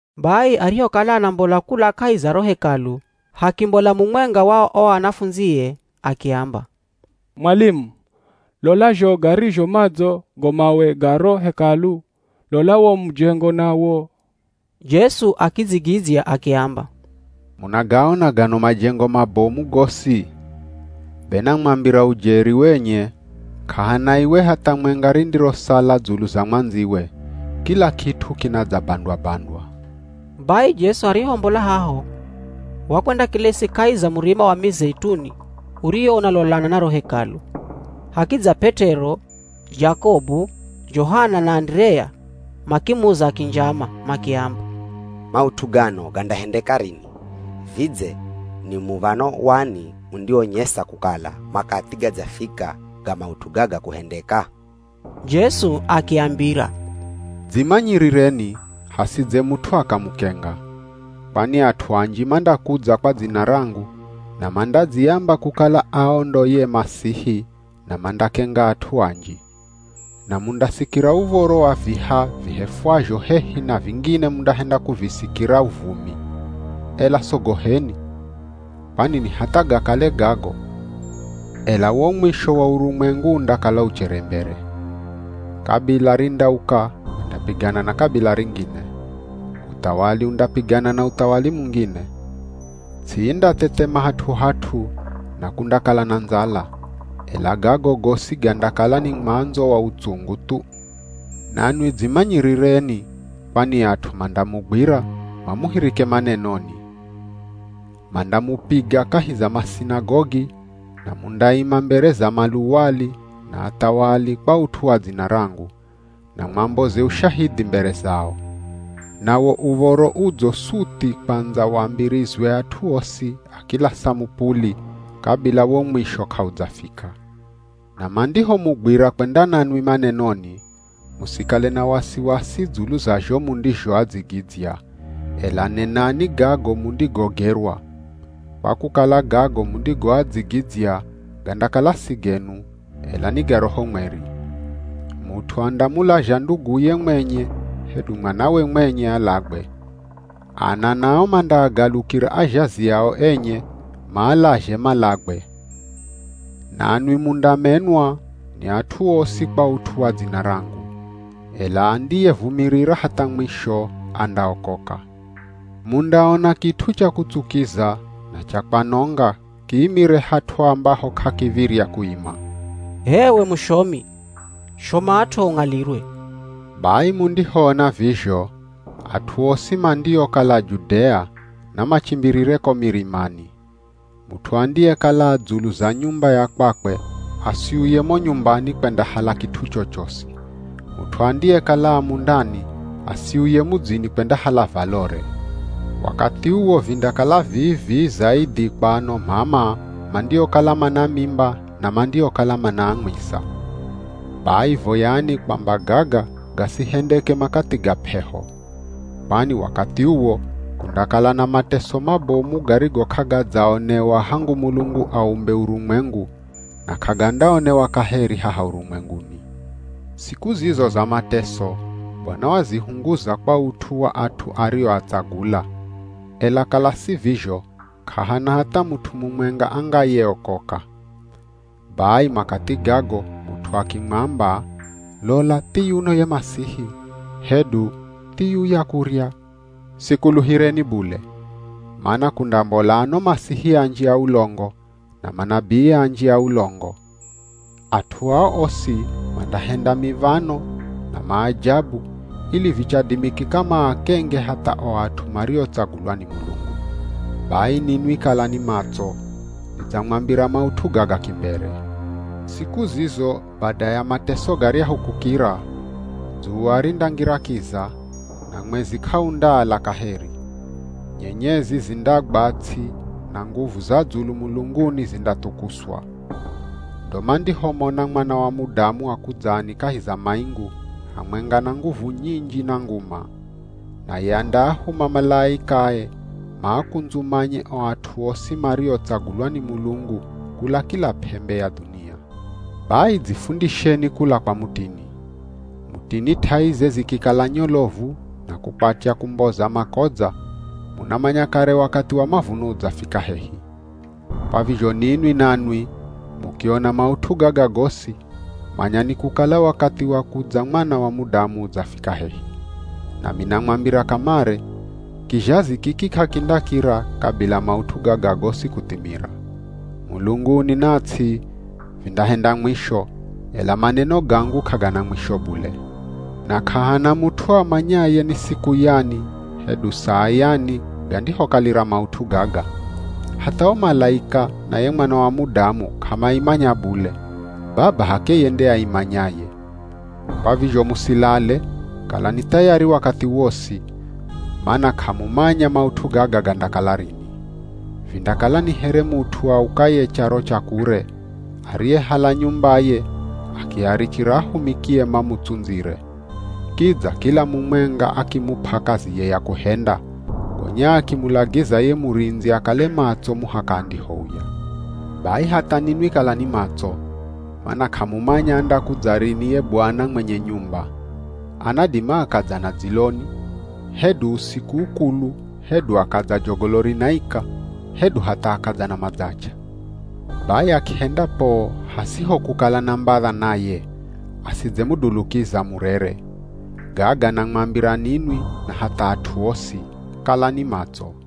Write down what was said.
Bai arihokala anambola kula kahi za ro Hekalu, hakimbola mumwenga wa o anafundzie akiamba, “Mwalimu, lola zho garizho madzo go mawe ga ro Hekalu! Lola wo mujengo nawo!” Jesu akidzigidzya akiamba, “Munagaona gano majengo mabomu gosi? Be namwambira ujeri wenye k'ahana iwe hatha mwenga rindirosala dzulu za mwandziwe, kila kit'u kinadzabandwa-bandwa.” Bai Jesu arihombola haho wakwendakelesi kahi za Murima wa Mizeituni uriwo unalolana na ro Hekalu, hakidza P'et'ero, Jakobu, Johana na Anderea, makimuza kinjama makiamba, “Maut'u gano gandahendeka rini? Vidze ni muv̱ano wani undiwonyesa kukala makathi gadzafika ga maut'u gaga kuhendeka?” Jesu akiambira, “Dzimanyirireni hasidze mut'u akamukenga. Kwani at'u anji mandakudza kwa dzina rangu, na mandadziamba kukala ao ndo ye Masihi na mandakenga at'u anji. Na mundasikira uv̱oro wa viha vihefwazho hehi na vingine mundahenda kuvisikira uvumi, ela sogoheni, kwani ni hatha gakale gago, ela wo mwisho wa urumwengu undakala uchere mbere. Kabila rindauka kwendapigana na kabila ringine. Uthawali undapigana na uthawali mungine. Ts'i indathethema hat'u-hat'u na kundakala na ndzala. Ela gago gosi gandakala ni mwandzo wa utsungu thu. “Nanwi dzimanyirireni kwani at'u mandamugwira mamuhirike manenoni. Mandamupiga kahi za masinagogi na mundaima mbere za maluwali na athawali kwa ut'u wa dzina rangu, na mwamboze ushahidhi mbere zao. Nawo Uv̱oro Udzo suthi kwandza wambirizwe at'u osi a kila samupuli kabila wo mwisho k'audzafika. Na mandihomugwira kwenda nanwi manenoni, musikale na wasiwasi dzulu za zho mundizhoadzigidzya, ela nenani gago mundigogerwa. Kwa kukala gago mundigoadzigidzya gandakala si genu, ela ni ga Roho Mweri. “Mut'u andamulazha nduguye mwenye hedu mwanawe mwenye alagwe. Ana nao mandaagalukira azhazi ao enye, maalazhe malagwe. Nanwi mundamenwa ni at'u osi kwa ut'u wa dzina rangu. Ela andiyevumirira hatha mwisho andaokoka. “Mundaona kit'u cha kutsukiza na cha kwanonga kiimire hat'u ambaho k'akiv̱irya kuima. (H'ewe mushomi, shomat'o ung'alirwe.) Bai mundihoona vizho, at'u osi mandiokala Judea namachimbirire ko mirimani. Mut'u andiyekala a dzulu za nyumba ya kwakwe asiuye mo nyumbani kwendahala kit'u chochosi. Mut'u andiyekala a mundani asiuye mudzini kwendahala valore. Wakathi uwo vindakala vii-vii zaidhi kwa ano m'ama mandiokala mana mimba na mandiokala manaamwisa. Bai voyani kwamba gaga gasihendeke makathi ga p'eho. Kwani wakathi uwo kundakala na mateso mabomu garigo k'agadzaonewa hangu Mulungu aumbe urumwengu na k'agandaonewa kaheri haha urumwenguni. Siku zizo za mateso Bwana wazihunguza kwa ut'u wa at'u arioatsagula, ela kala si vizho k'ahana hatha mut'u mumwenga angayeokoka. Bai makathi gago mut'u akimwamba, ‘Lola thiyuno ye Masihi!’ hedu, ‘Thiyuya kurya,’ sikuluhireni bule. Mana kundambola ano Masihi anji a ulongo, na manabii anji a ulongo. At'u ao osi mandahenda miv̱ano na maajabu ili vichadimikika maakenge hatha o at'u mariotsagulwa ni Mulungu. Bai ninwi kalani matso, nidzamwambira maut'u gaga kimbere.” “Siku zizo bada ya mateso garyahu kukira, dzuwa rindangira kiza, na mwezi k'aundaala kaheri. Nyenyezi zindagwa ts'i na nguvu za dzulu mulunguni zindathukuswa. Ndo mandihomona Mwana wa Mudamu akudzani kahi za maingu, hamwenga na nguvu nyinji na nguma. Naye andaahuma malaikae maakundzumanye o at'u osi mariotsagulwa ni Mulungu kula kila p'embe ya dhunia. “Bai dzifundisheni kula kwa mutini. Mutini t'aize zikikala nyolovu na kukwatya kumboza makodza munamanya kare wakathi wa mavuno udzafika hehi. Kwa vizho ninwi nanwi mukiona maut'u gaga gosi, manyani kukala wakathi wa kudza Mwana wa Mudamu udzafika hehi. Nami namwambira kamare, kizhazi kiki k'akindakira kabila maut'u gaga gosi kuthimira. Mulunguni na ts'i, vindahenda mwisho, ela maneno gangu k'agana mwisho bule! “Na k'ahana mut'u amanyaye ni siku yani hedu saa yani gandihokalira maut'u gaga, hatha o malaika na ye Mwana wa Mudamu k'amaimanya bule, Baba h'akeye nde aimanyaye. Kwa vizho musilale, kalani thayari wakathi wosi, mana k'amumanya maut'u gaga gandakala rini. Vindakala ni here mut'u aukaye charo cha kure, ariyehala nyumbaye akiarichira ahumikie mamutsundzire. Kidza kila mumwenga akimup'a kaziye ya kuhenda, gonya akimulagiza ye murindzi akale matso muhaka andihouya. Bai hatha ninwi kalani matso, mana k'amumanya andakudza rini ye bwana mwenye nyumba. Anadima akadza na dziloni, hedu usiku ukulu hedu akadza jogolo rinaika hedu hatha akadza na madzach'a. Bai akihenda poo hasiho kukala na mbadha naye, asidzemudulukiza murere. Gaga namwambira ninwi na hatha at'u osi. Kalani matso.”